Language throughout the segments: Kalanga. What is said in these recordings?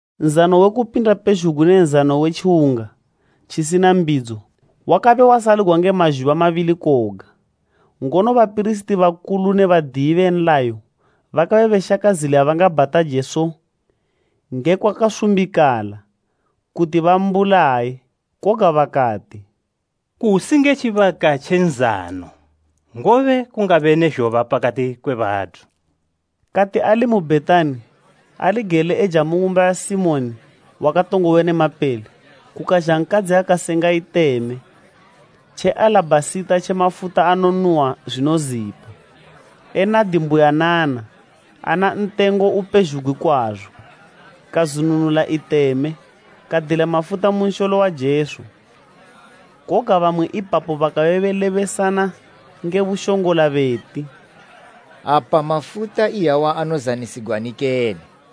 Nzano we Kupinda pezhugwi ne Nzano we Tjiwunga tjisina Mbidzo, wakabe wasaligwa nge mazhuba mabili koga. Ngono bapirisiti bakulu ne badiyi be nlayo bakabe beshaka zila ya bangabhata Jesu ngekwa kasumbikala, kuti bambulaye. Koga bakati, “Kusi nge tjibaka tje nzano, ngobe kungabe ne zhoba pakati kwe bathu.” Kati ali mu Bhetani, ali gele eja mu ng'umba ya Simoni wakatongobe ne mapele, kukazha nkadzi akasenga iteme tje alabhasita tje mafuta anonuhwa zwinozipa, e nadi mbuyanana, ana ntengo upezhugwi kwazo, kazwinunula iteme, kadila mafuta mu nsholo wa Jesu. Koga bamwe ipapo bakabe belebesana nge bushongola beti, “Apa mafuta iyawa anozanisigwani kene?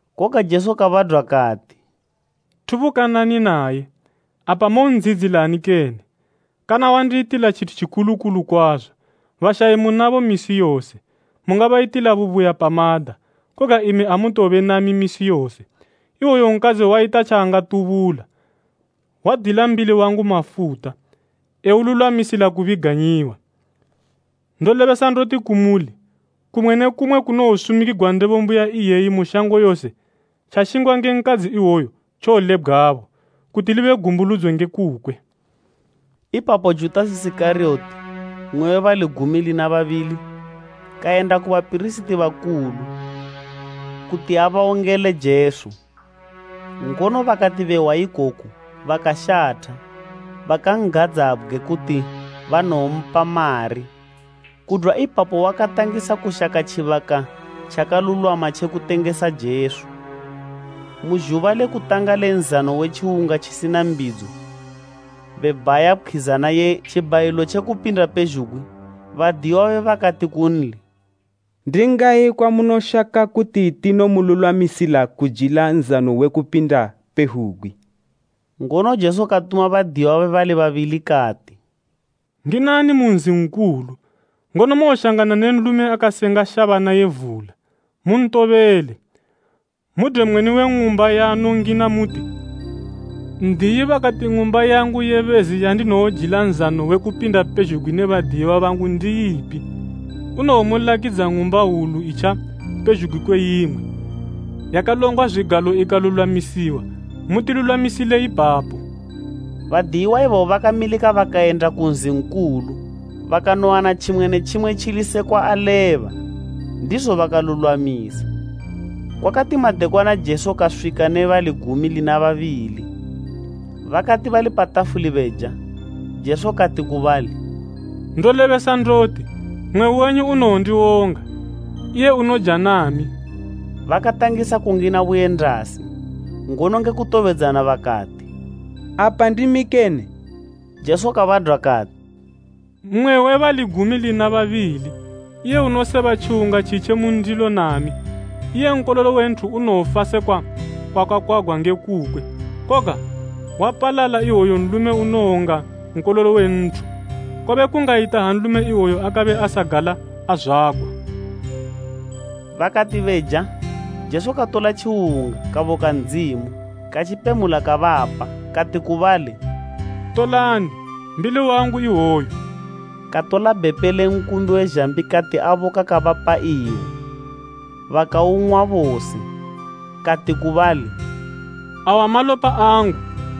Koga Jesu kabadwa kati, “Thubukanani naye. Apa mon'dziyidzilani kene? Kana wandiyitila tjithu tjikulu kulu kwazo. Bashayi munabo misi yose, mungabayitila bubuya pamada, koga imi amutowobe nami misi yose. Ihwoyu nkadzi wayita tjaangatubula, wadila mbili wangu mafuta, eululwamisila kubiganyiwa. Ndolebesa ndoti kumuli, kumwe ne kumwe kunowosumikigwa Ndebo mbuya iyeyi mu shango yose, tjashingwa nge nkadzi ihwoyu tjowolebgwabo, kuti libe gumbuludzo nge kukwe.” Ipapo Judasi Isikariyoti, mmwe we bali gumi lina babili, kayenda ku bapirisiti bakulu kuti abawongele Jesu. Ngono bakati behwa ikoku bakashatha, bakan'gadzabgwe kuti banowompa mari. Kudwa ipapo wakatangisa kushaka tjibaka tjakalulwama tje kutengesa Jesu. Mu zhuba le kutanga le Nzano we Tjiwunga Tjisina Mbidzo, be bhaya pkhwizana ye tjibhayilo tje kupinda pezhugwi, badiyiwa babe bakati kunli, “Ndi ngayi kwamunoshaka kuti tinomululwamisila kujila Nzano we Kupinda pezhugwi?” Ngono Jesu katuma badiyiwa babe bali babili kati, “Nginani mu nzi nkulu, ngono mowoshangana ne nlume akasenga shabana ye vula, muntobele. Mudwe mweni we ng'umba yaanowongina muti, ‘N'diyi bakati ng'umba yangu ye bezi yandinowojila Nzano we Kupinda pezhugwi ne badiyiwa bangu ndi ipi?’ Unowomulakidza ng'umba hwulu itjapezhugwi kwe imwe, yakalongwa zwigalo ikalulwamisiwa, mutilulwamisile ipapo.” Badiyiwa ibabo bakamilika bakayenda ku nzi nkulu, bakanowana tjimwe ne tjimwe tjili sekwa aleba, ndizo bakalulwamisa. Kwakati madekwana Jesu kaswika ne bali gumi lina babili. Bakati bali pa tafuli beja, Jesu kati ku bali, “Ndolebesa ndoti, mmwe wenyu unowondiwonga, iye unoja nami.” Bakatangisa kungina buyendasi, ngono nge kutobedzana bakati, “Apa ndimi kene?” Jesu kabadwa kati, “Mmwe we bali gumi lina babili, iye unoseba tjiwunga tjitje mu ndilo nami. Iye Nkololo we Nthu unowofa sekwa kwakakwagwa nge kukwe, koga wapalala iwoyo nlume unowonga Nkololo we Nthu! Kwabe kungayita ha nlume iwoyo akabe asagala azwagwa.” Bakati beja, Jesu katola tjiwunga, kaboka Ndzimu, katjipemula kabapa, kati ku bali, “Tolani, mbili wangu ihwoyu.” Katola bhepe le nkumbi we zhambi kati aboka kabapa iwo, bakaung'wa bose. Kati ku bali, “Awa malopa angu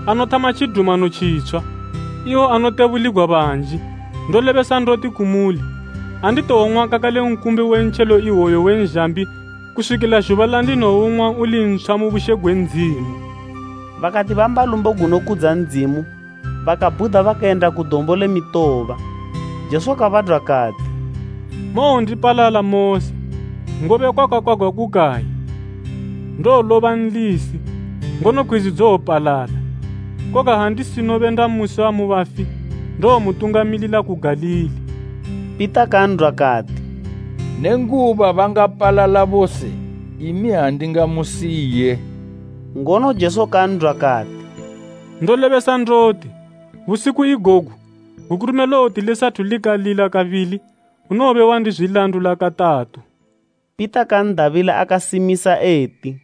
anothama tjidumano tjitshwa, iwo anotebuligwa banji. Ndolebesa ndoti kumuli, anditowong'wa kakale nkumbi we ntjelo iwoyu we nzhambi kuswikila zhuba landinowoung'wa uli ntshwa mu bushe gwe Ndzimu.” Bakati bamba lumbo gunokudza Ndzimu, bakabhuda bakayenda ku Dombo le Mitoba. Jesu kabadwa kati, “Mowondipalala mose, ngobe kwakakwagwa kukayi, “ ‘Ndowoloba nlisi, ngono pkhwizi dzowopalala.’ “Koga ha ndisinobe ndamusiwa mu bafi, ndowomutungamilila ku Galili.” Pita kan'dwa kati, “Nenguba bangapalala bose, imi andingamusiye.” Ngono Jesu kan'dwa kati, “Ndolebesa ndoti, busiku igogu, gukurume lowoti lisathu likalila kabili, unowobe wandizwilandula katatu.” Pita kan'dabila akasimisa eti,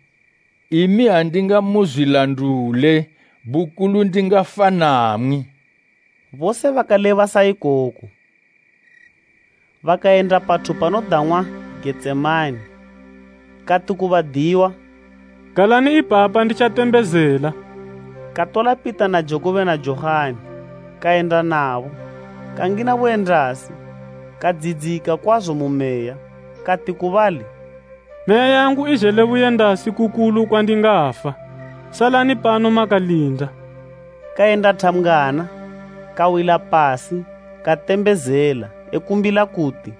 “Imi andingamuzwilandule, bukulu ndingafa namwi.” Bose bakaleba sa ikoko. Bakayenda pathu panodang'wa Getsemane, kati ku badiyiwa, “Galani ipapa nditjatembezela.” Katola Pita na Jakubo na Johani, kayenda nabo, kangina buyendasi, kadziyidzika kwazo mu meya, kati ku bali, “Meya yangu izhele buyendasi kukulu kwandingafa. Salani pano makalinda.” Kayenda thambgwana, kawila pasi katembezela ekumbila kuti,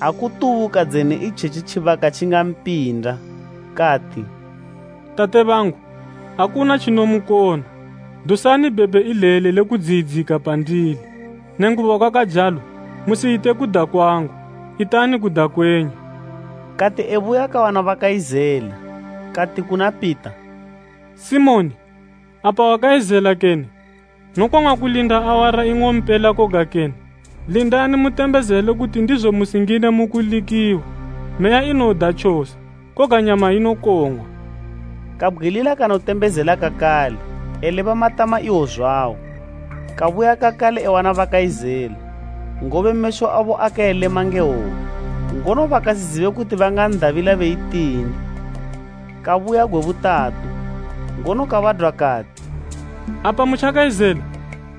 ha kutubuka dzene itjetji tjibaka tjingampinda. Kati, “Tate bangu, akuna tjinomukona, dusani bhepe ileli le kudziyidzika pandili, nenguba kwakajalo, musiyite kuda kwangu, itani kuda kwenyu.” Kati ebuya kawana bakayizela, kati kuna Pita, “Simoni, apa wakayizela kene? Nokong'wa kulinda awara ing'ompela koga kene? Lindani mutembezele kuti ndizo musingine mu kulikiwa. Meya inoda tjose, koga nyama inokong'wa.” Kabgwilila kanotembezela kakale eleba matama iwo zwawo. Kabuya kakale ewana bakayizela, ngobe mesho abo akabe elema nge hwope. Ngono bakasizibe kuti bangan'dabila beyitini. Kabuya gwe butatu, ngono kabadwa kati, “Apa mutjakayizela,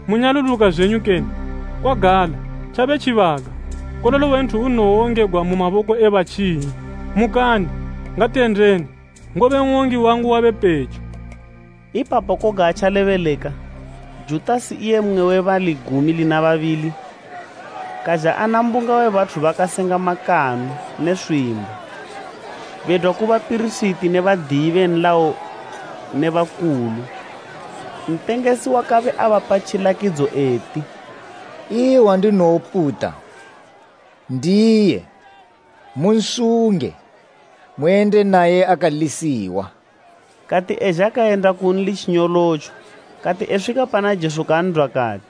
munyaluluka zwenyu kene? Kwagala, tjabe tjibaka, Nkololo we Nthu unowongegwa mu maboko e batjinyi. Mukani, ngatiyendeni, ngobe n'wongi wangu wabe pejo.” Ipapo koga atjalebeleka, Judasi, iye mmwe we bali gumi lina babili, kazha ana mbunga we bathu bakasenga makanu ne swimbo, bedwa ku bapirisiti ne badiyi be nlayo ne bakulu. Ntengesi wakabe abapa tjilakidzo eti, “Iye wandinowoputa, ndiye, munsunge, muyende naye akalisiwa.” Kati ezha kayenda kunli tjinyolotjo, kati eswika pana Jesu kan'dwa kati,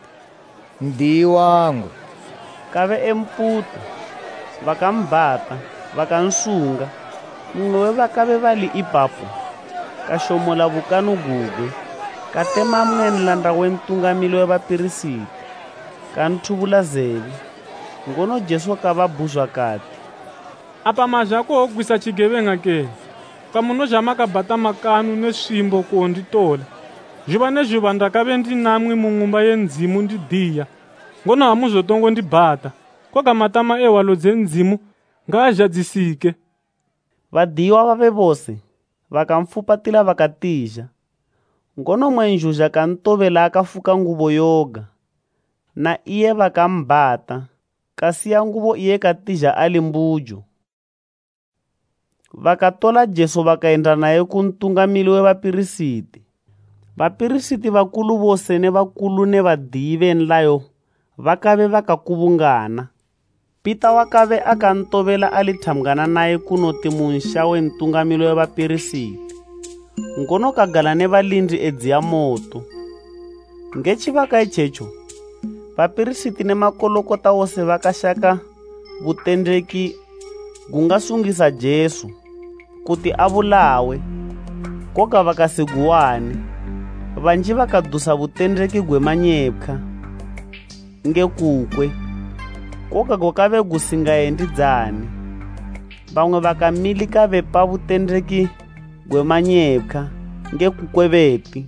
“N'diyi wangu,” kabe emputa. Bakambhata bakansunga. Mmwe we bakabe bali ipapo kashomola bukanu gugwe, katema mmwe nlanda we Ntungamili we bapirisiti, kanthubula zebe. Ngono Jesu kababhuzwa kati, “Apa mazha kuwogwisa tjigebeng'a kene, kwamunozha makabhata makanu ne swimbo kuwonditola? Zhuba ne zhuba ndakabe ndi namwi mu Ng'umba ye Ndzimu ndidiya, ngono amuzotongo ndibhata. Koga matama e hwalo dze Ndzimu ngaazhadzisike.” Badiyiwa babe bose bakanfupatila bakatizha. Ngono mmwe nzhuzha kantobela akafuka ngubo yoga, na iye bakambhata, kasiya ngubo iye katizha ali mbujo. Bakatola Jesu bakayenda naye ku Ntungamili we bapirisiti. Bapirisiti bakulu bose ne bakulu ne badiyi be nlayo bakabe bakakubungana. Pita wakabe akantobela ali thambgwana naye kunoti mu nsha we Ntungamili we bapirisiti, ngono kagala ne balindi edziya moto. Nge tjibaka itjetjo, bapirisiti ne makulukota wose bakashaka butendeki gungasungisa Jesu, kuti abulawe, koga bakasiguwane. Banji bakadusa butendeki gwe manyepkhwa nge kukwe, koga gwakabe gusingayendidzane. Bamwe bakamilika bepa butendeki gwe manyepkhwa nge kukwe beti,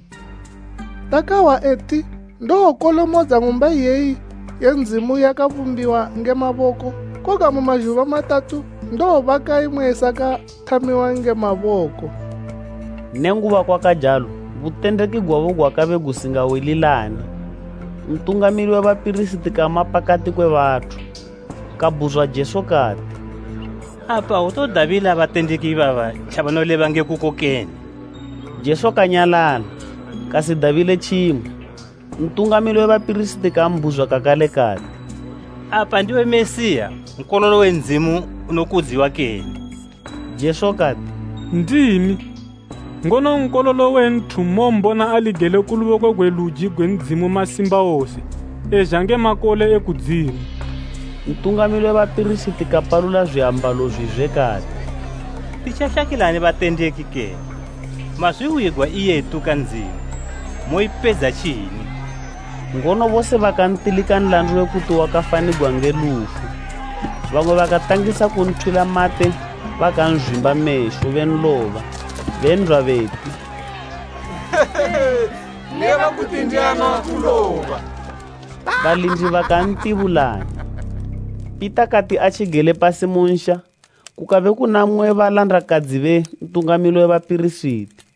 “Takahwa eti, ‘Ndowokolomodza ng'umba iyeyi ye Ndzimu yakabumbiwa nge maboko, koga mu mazhuba matatu ndowobaka imwe isakathamiwa nge maboko.’” Nenguba kwakajalo, butendeki gwabo gwakabe gusingawililane. Ntungamili we bapirisiti kama pakati kwe bathu, kabhuzwa Jesu eti, “Apa autodabila batendeki ibaba tjabanoleba ngekuko kene?” Jesu kanyalala, kasidabile tjimwe. Ntungamili we bapirisiti kambhuzwa kakale kati, “Apa ndiwe Mesiya, Nkololo we Ndzimu unokudziwa kene?” Jesu kati, “Ndimi. Ngono Nkololo we Nthu mowombona ali gele ku luboko gwe luji gwe Ndzimu Masimbawose, ezha nge makole e kudzimu.” Ntungamili we bapirisiti kapalula zwiambalo zwizwe kati, “Titjashakilani batendeki kene? Mazwihwigwa iye etuka Ndzimu. Moipedza tjini?” Ngono bose bakantilika nlandu we kuti wakafanigwa nge lufu. Bamwe bakatangisa kunthwila mate bakanzwimba mesho benloba, ben'dwa beti, “Leba kuti ndiani wakuloba.” Balindi bakantibulanya. Pita kati atjigele pasi mu nsha, kukabe kuzha mmwe we balandakadzi be Ntungamili we bapirisiti;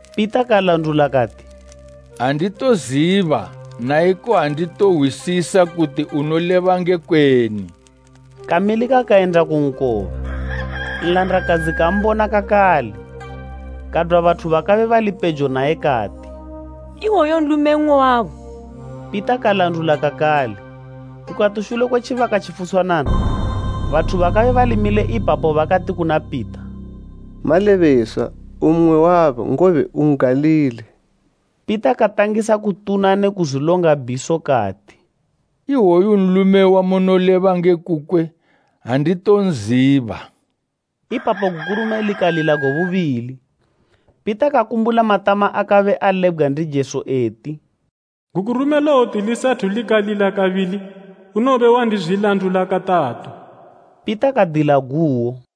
Pita kalandula kati, “Anditoziba naiko anditohwisisa kuti unoleba ngekweni.” Kamilika kayenda ku nkoba. Nlandakadzi kambona kakale, kadwa bathu bakabe bali pejo naye kati, “Iwoyu nlume mmwe wabo.” Pita kalandula kakale. Kukati shule kwe tjibaka tjifutshwanana, bathu bakabe bali mile ipapo bakati kuna Pita, “Malebeswa, u mmwe wabo, ngobe u N'galili.” Pita katangisa kutuna ne kuzwilonga bhiso kati, “Iwoyu nlume wamunoleba nge kukwe anditonziba.” Ipapo gukurume likalila gwe bubili, Pita kakumbula matama akabe alebgwa ndi Jesu eti, “Gukurume lowoti lisathu likalila kabili, unowobe wandizwilandula katatu.” Pita kadila guwo.